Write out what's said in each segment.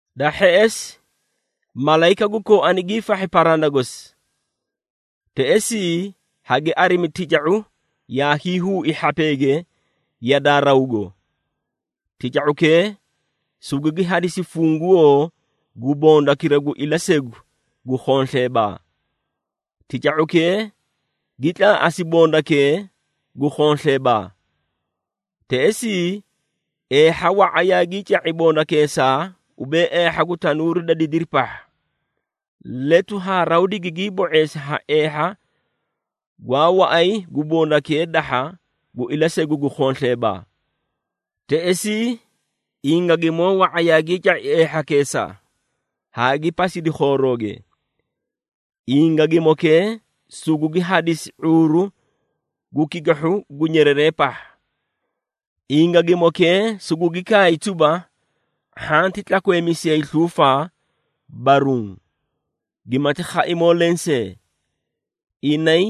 Da hheꞌesi, malayika gu kooani giifahhi paranda gosi. Teꞌesii, hagi arimi tica⁄u yaa hiihuui hhapeege yadaa rawgo. Tica⁄ukee sugugi hadisi funguwoo gu bondakira gu ilasegu gu khonsleebaa. Tica⁄ukee gi tlaaꞌasi bondakee gu khonsleebaa. Teꞌesii, eehha wa⁄a yaagii ca⁄i bondakeesaa ubee eehha gu tanuuri da didiri pahha. Letu haa raw digigii bo⁄eesii ha eehha gwaa waꞌay gu bondakee dahha gu ilasegu gu khonsleebaa. Teꞌesii, ingagimoo wa⁄a yaagii ca⁄i eehhakeesaa haa gi pasidi khoorooge. Ingagimookee sugugi hadisi ⁄uuru gu kikihhu gu nyereree pahha. Ingagimookee sugugi kaay tuba, hhanti tlakweemisiyay sluufaa, baruũ, gimati khaimoo lensee. Inay,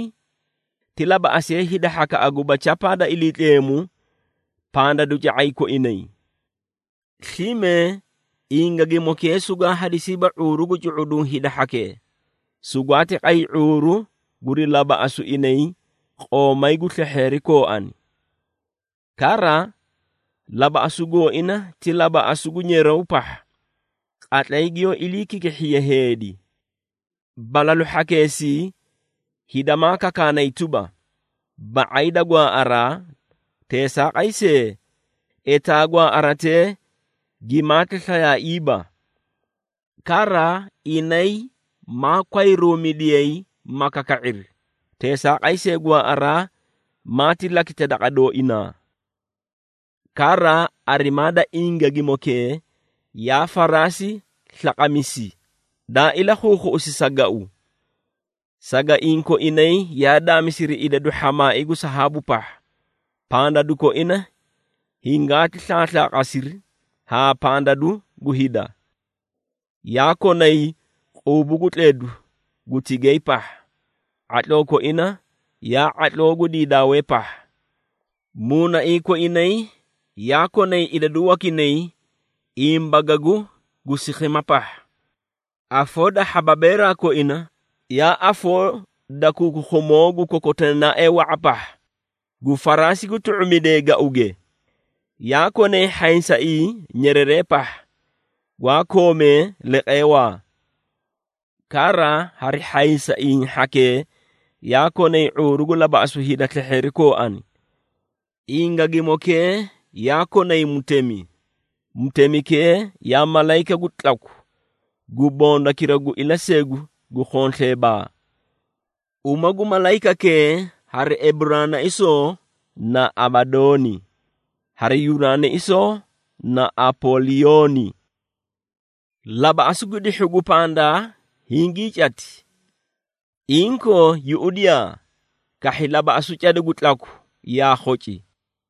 ti labaꞌasiyee hida hhakaꞌa guba chapaa da Iliitleemu pandaduca⁄ay koinay. Slime Ingagimookee sugwaa hadisiiba ⁄uuru gu cu⁄uduũ hida hhakee, sugwaati qay ⁄uuru guri labaꞌasu inay qoomay gu slehheeri kooani. Kara, labaꞌasu gooina ti labaꞌasu gu nyeraw pahha qatlay giyoó iliikikihhiye heedi. Balalu hhakeesii hida maa kakaanay tuba, ba⁄ay da gwaaꞌaraa, teesaaqay see, etaa gwaaꞌaratee gimaati slayaaiiba. Kara, inay maa kwayruumidiyay ma kaka⁄iri, teesaaqay see, gwaaꞌaraa maati lakita daqa dooinaa. Kara, arimaa da ingagimokee yaa faraasi slaqamisi, daa ilakhuukhuꞌusi sa gau. Sagaiĩ koinay yaa daamisiri idadu hhamaai gu sahaabu pahha, pandadu koina hingaati slaaslaaqasiri haa pandadu gu hida. Yaa konay quubu gu tledu gu tigay pahha, ⁄atloo koina yaa ⁄atloo gu diidaawee pahha. Muunaiĩ koinay yaa konay idadu wakinay imbagagu gu sikhima pahha. Afoo da hhababeeraa koina, yaa afoo da kukukhumoo gu kokoteenaaee wa⁄a pahha, gu faraasi gu tu⁄umidee gauge. Yaa konay hhaysaiĩ nyereree pahha, gwa koomee leqeewaa. Kara hari hhaysaiĩ hhakee yaa konay ⁄uuru gu labaꞌasu hida slehheeri kooani. Ingagimokee yaa konay mutemi, mutemikee yaa malayika gu tlaku gu bondakira gu ilasegu gu khonsleebaa. Uma gu malayikakee hari Eburaanaisoo na Abadooni, hari Yunaanaisoo na Apooliyooni. Labaꞌasu gu dihhu gu pandaa hingii cati. Inkoo yuꞌudiyaa! Kahhi labaꞌasu cada gu tlaku yaa khoci.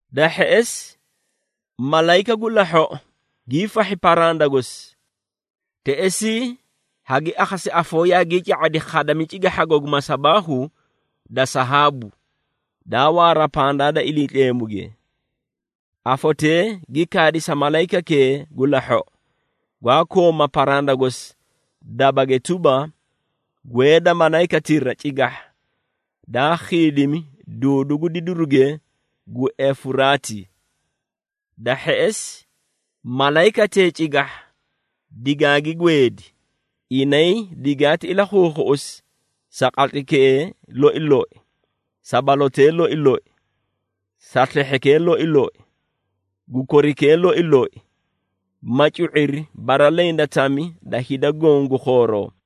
Da hheꞌesi, malayika gu lahhoꞌo giifahhi paranda gosi. Teꞌesii, hagi akhasi afoo yaagii ca⁄adi khadami cigahhago gu masabaahu da sahaabu, daa waara pandaa da Iliitleemuge. Afotee gi kaadi sa malayikakee gu lahhoꞌo, gwaa kooma paranda gosi dabage tuba, “Gweeda malayikatira cigahha daa khiidimi duudu gu didiruge gu Efuraati.” Da hheꞌesi, malayikatee cigahha digaagi gweedi, inay digaati ilakhuukhuꞌusi sa qatlaykee loi loi, sa balotee loi loi, sa slehhekee loi loi gu korikee loi loi, ma cu⁄iri bara leẽ da tami da hida goõ gu khooroo.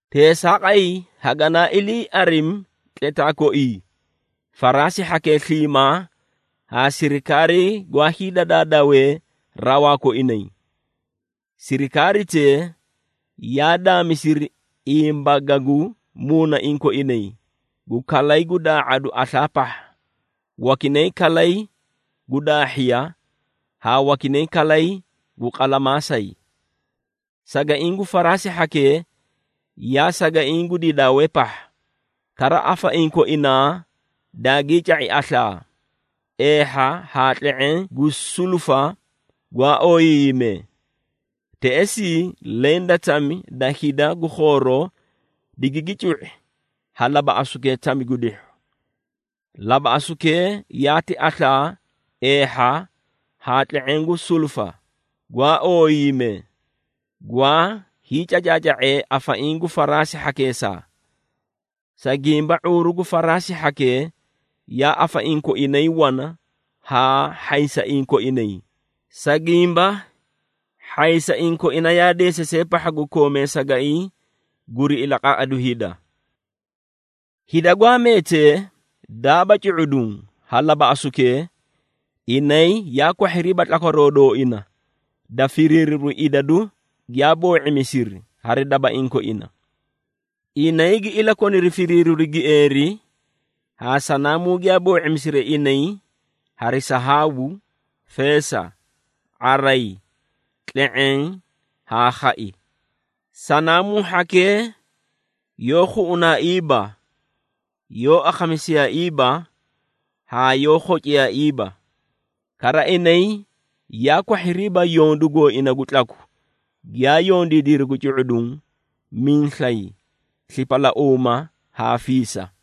Teesaaqay, haganaa ilii arimi tletaa koii, faraasi hhakee sliimaa haa sirikaarii gwaa hiidadawee rawaa koinay. Sirikaaritee, yaa daamisiri imbagagu muunaiĩ koinay, gu kalay gu daa⁄adu aslaa pahha, wakinay kalay gu daahhiya haa wakinay kalay gu qalamaasay. Sagaiĩ gu faraasi hhakee yaa sagaiĩ gu diidaawee pahha, kara afaiĩ koinaa daagii ca⁄i aslaa, eehha haa tle⁄eẽ gu sulufa gwaa ooyiiyimee. Teꞌesii, leẽ da tami da hida gu khooroo digigi cu⁄i ha labaꞌasukee tami gu dihhu. Labaꞌasukee yaati aslaa, eehha haa tle⁄eẽ gu sulufa gwaa ooyiiyimee, gwaa hiicacaaca⁄ee afaiĩ gu faraasi hhakeesaa. Sa gimba, ⁄uuru gu faraasi hhakee yaa afaiĩ koinay wana haa hhaysaiĩ koinay, sa gimba hhaysaiĩ koina yaa deesasee pahha gu koomee sagaiĩ guri ilaqaꞌadu hida. Hida gwaa meetee, daaba cu⁄uduũ ha labaꞌasukee, inay yaa kwahhiriiba tlakwaroo dooina da firiiriru idadu giyaa boo⁄imisiri hari dabaiĩ koina. Inay gi ilakoniri firiiriru gieeri haa sanaamuu giyaa boo⁄imisiri inay hari sahaabu, feesa, ⁄aray, tle⁄eẽ haa khai. Sanaamuu hhakee yoó khuꞌunaaiiba, yoó akhamisiyaaiiba haa yoó khociyaaiiba. Kara inay yaa kwahhiriiba yondu gooina gu tlaku giyaa yondiidiri gu cu⁄uduũ, miislay, slipalauuma haa fiisa.